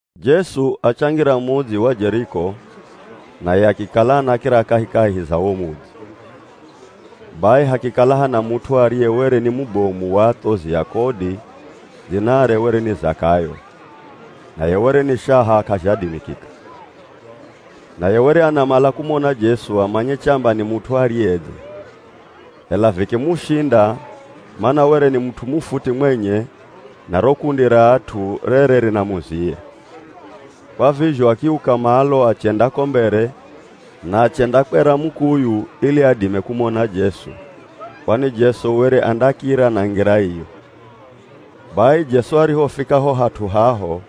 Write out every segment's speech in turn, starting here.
Jesu achangira mudzi wa Jeriko, naye akikala anakira kahikahi za wo mudzi. Bai hakikala hana mut'u ariye were ni mubomu wa athozi a kodi dzinare were ni Zakayo, naye were ni shaha k'azhadimikika. Naye were anamala kumona Jesu amanye chamba ni mut'u ariyedze, ela vikimushinda mana were ni mut'u mufuti mwenye na ro kundi ra at'u rere rinamuziya. Kwa vizho akiuka malo achenda ko mbere, na achendakwera mukuyu ili adime kumona Jesu, kwani Jesu were andakira na ngira iyo. Bai Jesu arihofika ho hat'u haho,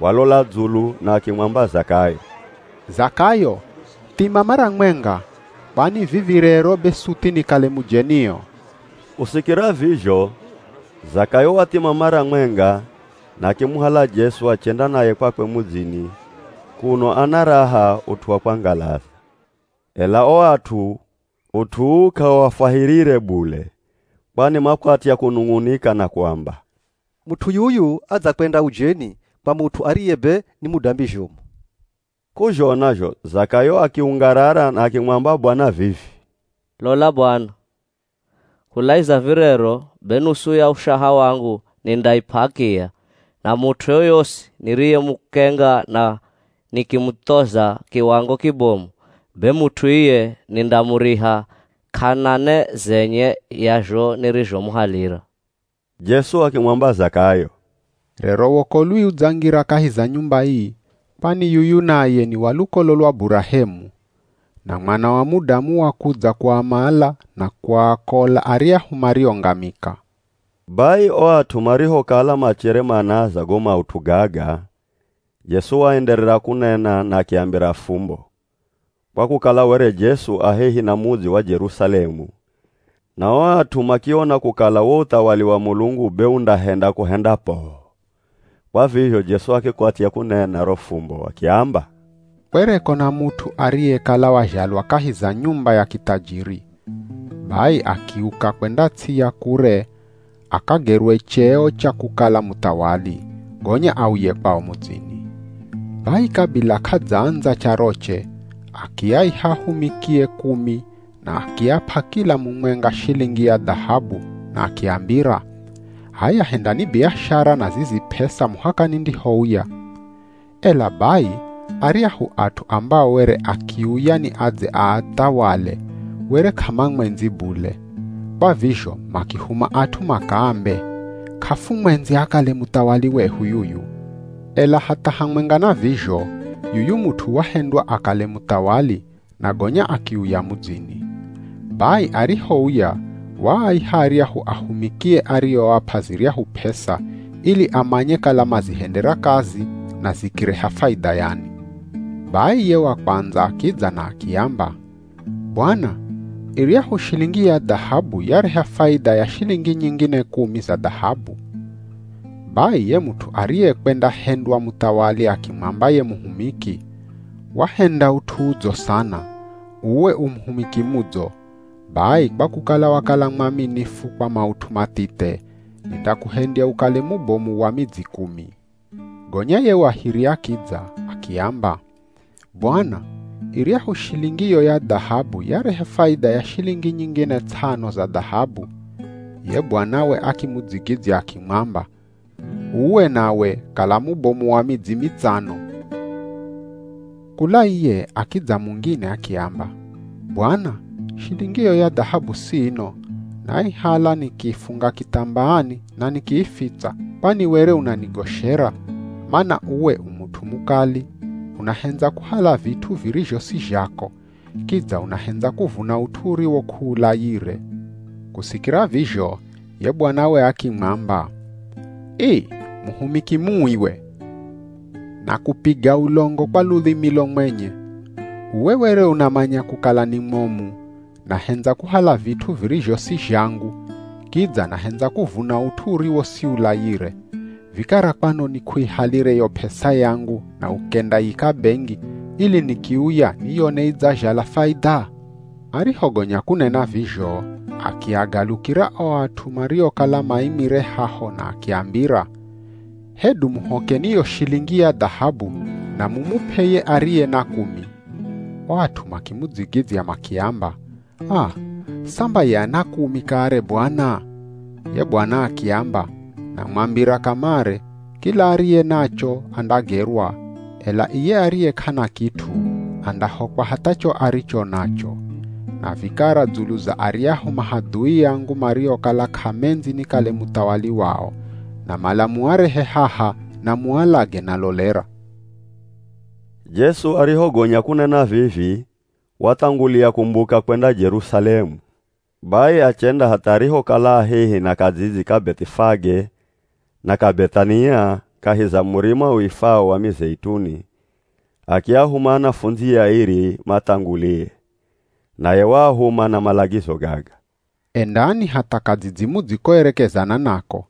walola dzulu na akimwamba Zakayo, “Zakayo, thima mara mwenga! Kwani vivi rero be suthi nikale mujenio.” Kusikira vizho Zakayo wathima mara mwenga na akimuhala Jesu achenda naye kwakwe mudzini kuno ana raha ut'u wa kwangalaza. Ela o at'u, ut'u uu k'auafwahirire bule, kwani makwatya kunung'unika na kuamba, “Mut'u yuyu adzakwenda ujeni kwa mut'u ariye be ni mudambi zhomu!” K'uzhona zho Zakayo akiungarara na akimwamba Bwana vivi, “Lola Bwana! Kulaiza virero be nusu ya ushaha wangu nindaip'a akiya, na mut'u yoyosi niriyemukenga na nikimuthoza kiwango kibomu, be mut'u iye nindamuriha k'ana ne zenye ya zho nirizhomuhalira.” Jesu akimwamba Zakayo, “Rero wokolwi udzangira kahi za nyumba ii, kwani yuyu naye ni wa lukolo lwa Burahemu. Na Mwana wa Mudamu wakudza kuamala na kuakola aryahu mariongamika.” Bai o at'u marihokala machere manaaza go maut'u gaga, Jesu waenderera kunena na akiambira fumbo, kwa kukala were Jesu a hehi na mudzi wa Jerusalemu na o at'u makiona kukala wo uthawali wa Mulungu be undahenda kuhenda poo. Kwa vizho Jesu akikwatya kunena ro fumbo akiamba, “Kwereko na mut'u ariyekala wazhalwa kahi za nyumba ya kithajiri. Bai akiuka kwenda ts'i ya kure akagerwe cheo cha kukala muthawali, gonya auye kwao mudzini. Bai kabila k'adzaandza charoche akiaiha ahumikie kumi na akiap'a kila mumwenga shilingi ya dhahabu, na akiambira, ‘H'aya hendani biashara na zizi p'esa muhaka nindihouya.’ Ela bai aryahu at'u ambao were akiuya ni adze aathawale were k'amamwendzi bule, kwa vizho makihuma at'u makaambe, ‘K'afumwendzi akale muthawali wehu yuyu.’ “Ela hatha hamwenga na vizho yuyu mut'u wahendwa akale muthawali na gonya akiuya mudzini. Bai arihouya waaiha aryahu ahumikie arioap'a ziryahu p'esa ili amanye kala mazihendera kazi na zikireha faidha yani. Bai ye wa kwandza akidza na akiamba, ‘Bwana iryahu shilingi ya dhahabu yareha faidha ya shilingi nyingine kumi za dhahabu.’ Bai ye mut'u ariyekwendahendywa muthawali akimwamba ye muhumiki, ‘Wahenda ut'u udzo sana, uwe u muhumiki mudzo! Bai kwa kukala wakala mwaminifu kwa maut'u mathithe, nindakuhendya ukale mubomu wa midzi kumi.’ Gonya ye wa hiri akidza, akiamba, ‘Bwana iryahu shilingi yo ya dhahabu yareha faidha ya shilingi nyingine ts'ano za dhahabu.’ Ye Bwanawe akimudzigidzya akimwamba, ‘Uwe nawe kala mubomu wa midzi mitsano.’ Kula iye akidza mungine, akiamba, ‘Bwana, shilingiyo ya dhahabu siino, naihala nikiifunga kithambaani na nikiifitsa. Kwani were unanigoshera mana uwe u mut'u mukali, unahendza kuhala vit'u virizho si zhako, kidza unahendza kuvuna ut'u uriwo k'uulayire.’ Kusikira vizho ye bwanawe akimwamba, ‘Ii, muhumiki mui we! Nakupiga ulongo kwa ludhimilo mwenye. Uwe were unamanya kukala ni mwomu, nahendza kuhala vit'u virizho si zhangu, kidza nahendza kuvuna ut'u uriwo siulayire, vikara kwanoni k'uihalire yo p'esa yangu na ukendayika bengi, ili nikiuya niyone idzazhala faidha?’ Arihogonya kunena vizho akiagalukira o at'u mariokala maimire haho na akiambira, ‘Hedu muhokeni yo shilingi ya dhahabu na mumup'e ye ariye na kumi.’ O at'u makimudzigidzya makiamba, ‘Aa, samba ye ana kumi kare Bwana?’ Ye Bwana akiamba, ‘Namwambira kamare, kila ariye nacho, andagerwa, ela iye ariye k'ana kit'u, andahokwa hatha cho aricho nacho. Na vikara dzulu za aryahu mahadhui angu mariokala k'amendzi nikale muthawali wao, namala muarehe haha na mualage nalolera.’” Jesu arihogonya kunena vivi wathangulia kumbuka kwenda Jerusalemu. Bai achenda hatha arihokala a hehi na kadzidzi ka Beth'ifage na ka Beth'ania kahi za Murima uifwao wa Mizeituni, akiahuma anafundzie airi mathangulie, naye waahuma na malagizo gaga, “Endani hatha kadzidzi mudzikoerekezana nako.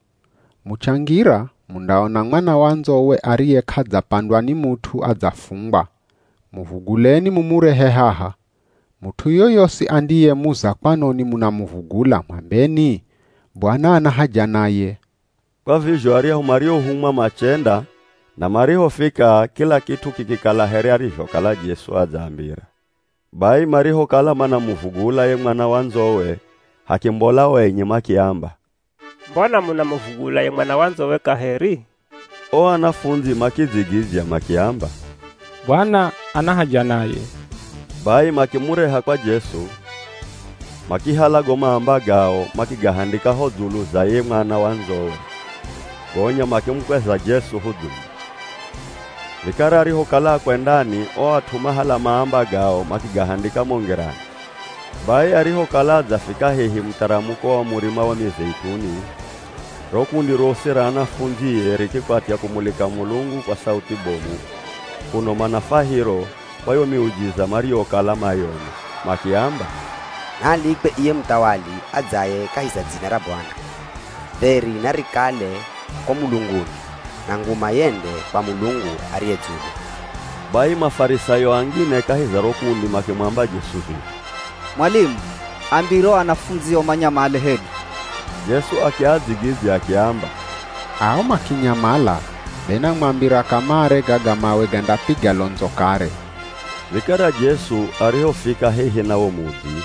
Muchangira mundaona mwana wa ndzowe ariye k'adzapandwa ni mut'u adzafungwa, muvuguleni mumurehe haha. Mut'u yoyosi andiyemuza kwanoni munamuvugula, mwambeni, ‘Bwana ana haja naye.’” Kwa vizho aryahu mariohumwa machenda na marihofika kila kit'u kikikala here arizhokala Jesu adzaambira. Bai marihokala manamuvugula ye mwana wa ndzowe, hakimbola o enye makiamba, “Mbona munamuvugula ye mwana wa ndzowe kaheri?” O anafundzi makidzigidzya makiamba, “Bwana ana haja naye.” Bai makimureha kwa Jesu, makihala go maamba gao makigahandika ho dzulu za ye mwana wa ndzowe, gonya makimukweza Jesu ho dzulu. Vikara arihokala akwendani, o at'u mahala maamba gao makigahandika mo ngirani. Bai arihokala adzafika hehi mutharamuko wa Murima wa Mizeituni, ro kundi rosi ra anafundzie rikikwatya kumulika Mulungu kwa sauthi bomu kuno mana fwahiro kwa yo miujiza mariyokala mayona. Makiamba, “Naalikwe iye muthawali adzaye kahi za dzina ra Bwana! Dheri narikale ko mulunguni, na nguma yende kwa Mulungu ariye dzulu!” Bai Mafarisayo angine kahi za ro kundi makimwamba Jesu vivi, “Mwalimu ambire o anafundzio manyamale hedu!” Jesu akiadzigidzya akiamba, “Ao makinyamala, be namwambira kamare gaga mawe gandapiga londzo kare.” Vikara Jesu arihofika hehi na wo mudzi,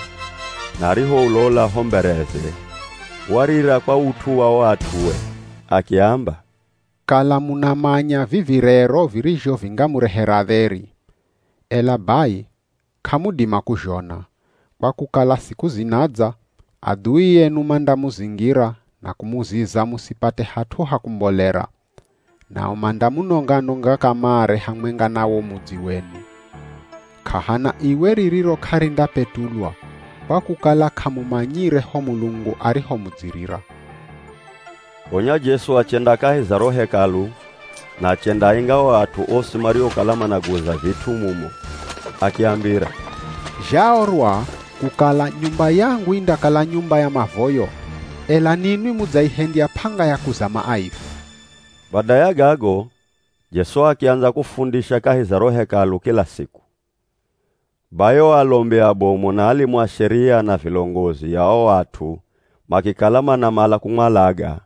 na arihoulola ho mbereze, warira kwa ut'u wa o at'ue. Akiamba, “Kala munamanya vivi rero virizho vingamurehera dheri! Ela bai k'amudima kuzhona, kwa kukala siku zinadza, adhui enu mandamuzingira na kumuziza musipate hat'u ha kumbolera. Nao mandamunonga-nonga kamare hamwenga na wo mudzi wenu. K'ahana iwe ririro k'arindapetulwa, kwa kukala k'amumanyire ho Mulungu arihomudzirira.” Gonya Jesu achenda kahi za ro Hekalu na achendaainga o at'u osi mariokala managuza vit'u mumo. Akiambira, “Zhaorwa kukala, ‘Nyumba yangu indakala nyumba ya mavoyo,’ ela ninwi mudzaihendya p'anga ya kuzama aivi.” Bada ya gago Jesu akiandza kufundisha kahi za ro Hekalu kila siku. Bai o alombi abomu, na alimu a Sheria na vilongozi a o at'u makikala manamala kumwalaga,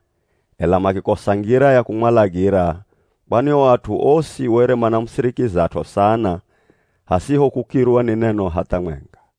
ela makikosa ngira ya kumwalagira, kwani o at'u osi were manamusirikizat'o sana hasiho kukirwa ni neno hatha mwenga.